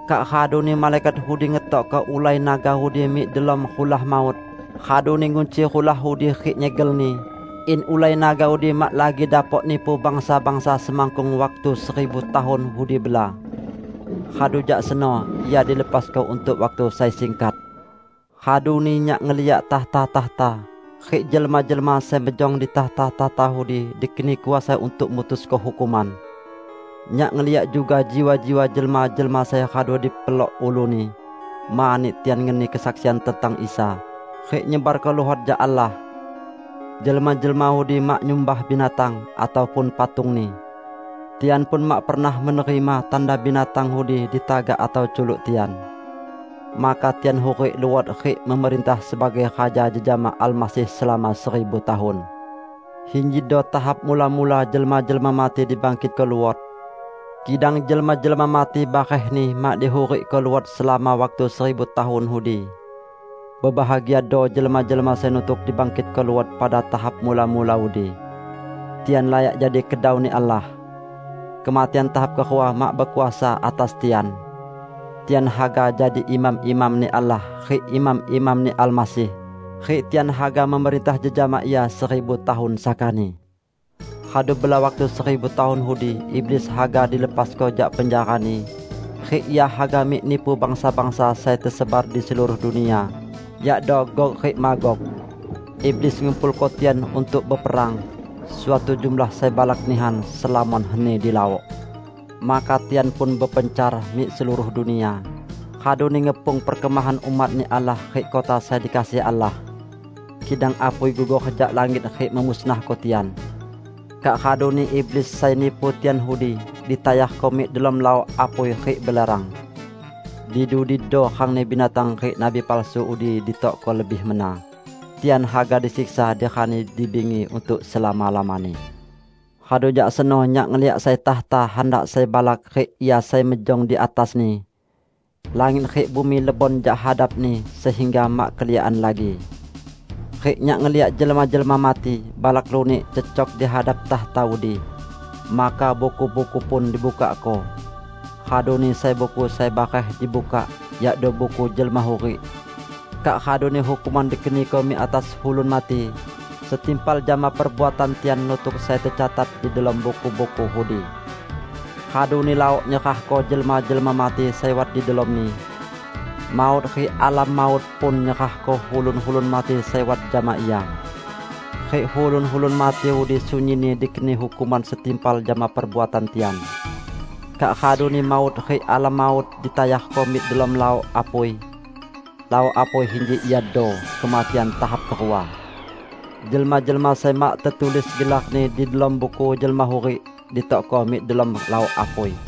Kak raduni malaikat udi ngetokko ulai naga udi mik delom rulah maut, raduni ngunci rulah udi rik nyegelni, in ulai naga udi mak lagi dapok nipu bangsa-bangsa semakkung waktu seribu tahun udi bela. Radu jak seno ia dilepasko untuk waktu sai singkat. Raduni nyak ngeliak takhta-takhta, rik jelma-jelma sai mejong di takhta-takhta udi dikeni kuasa untuk mutusko hukuman. Nyak ngeliak juga jiwa-jiwa jelma-jelma sai radu dipelok uluni mani tian ngeni kesaksian tentang Isa, rik nyebarko luhot jak Allah. Jelma-jelma udi mak nyumbah binatang, ataupun patungni. Tian pun mak pernah menerima tanda binatang udi di tagak atau culuk tian. Maka tian hurik luot rik memerintah sebagai raja jejama Almasih selama seribu tahun. Injido tahap mula-mula jelma-jelma mati dibangkitko luot. (Kidang jelma-jelma mati barehni mak dihurikko luot selama waktu seribu tahun udi.) Bebahagiado jelma-jelma sai nutuk dibangkitko luot pada tahap mula-mula udi. Tian layak jadi kedau-Ni Allah. Kematian tahap kerua mak bekuasa atas tian. Tian haga jadi imam-imam-Ni Allah rik imam-imam-Ni Almasih; rik tian haga memerintah jejama Ia seribu tahun sakani. Radu bela waktu seribu tahun udi, iblis haga dilepasko jak penjarani, rik ia haga mik nipu bangsa-bangsa sai tesebar di seluruh dunia, yakdo Gog rik Magog. Iblis ngumpulko tian untuk beperang, suatu jumlah sai balak nihan, selamon heni di laok. Maka tian pun bepencar mik seluruh dunia, raduni ngepung perkemahan umat-Ni Allah rik kota sai dikasihi Allah. Kidang apui gugor jak langit rik memusnahko tian. Kak raduni iblis sai nipu tian udi, ditayarko mik delom laok apui rik belerang. Di dudido rangni binatang rik nabi palsu udi ditokko lebih mena. Tian haga disiksa di rani di bingi untuk selama-lamani. Radu jak seno nyak ngeliak sai takhta handak sai balak rik Ia sai mejong di atasni. Langit rik bumi lebon jak hadap-Ni, sehingga mak keliakan lagi. Rik nyak ngeliak jelma-jelma mati, balak lunik, cecok di hadap takhta udi. Maka buku-buku pun dibukakko. Raduni sai buku sai bareh dibukak, yakdo Buku Jelma Hurik. Kak raduni hukuman dikeniko mik atas ulun mati, setimpal jama perbuatan tian nutuk sai tecatat di delom buku-buku udi. Raduni laok nyerahko jelma-jelma mati sai wat di delomni. Maut rik Alam Maut pun nyerahko ulun-ulun mati sai wat jama ia. Rik ulun-ulun mati udi sunyinni dikeni hukuman setimpal jama perbuatan tian. Kak raduni Maut rik Alam Maut ditayarko mik delom laok apui. (Laok apui inji iado kematian tahap kerua.) Jelma-jelma sai mak tetulis gelarni di delom Buku Jelma Hurik, ditokko mik delom laok apui.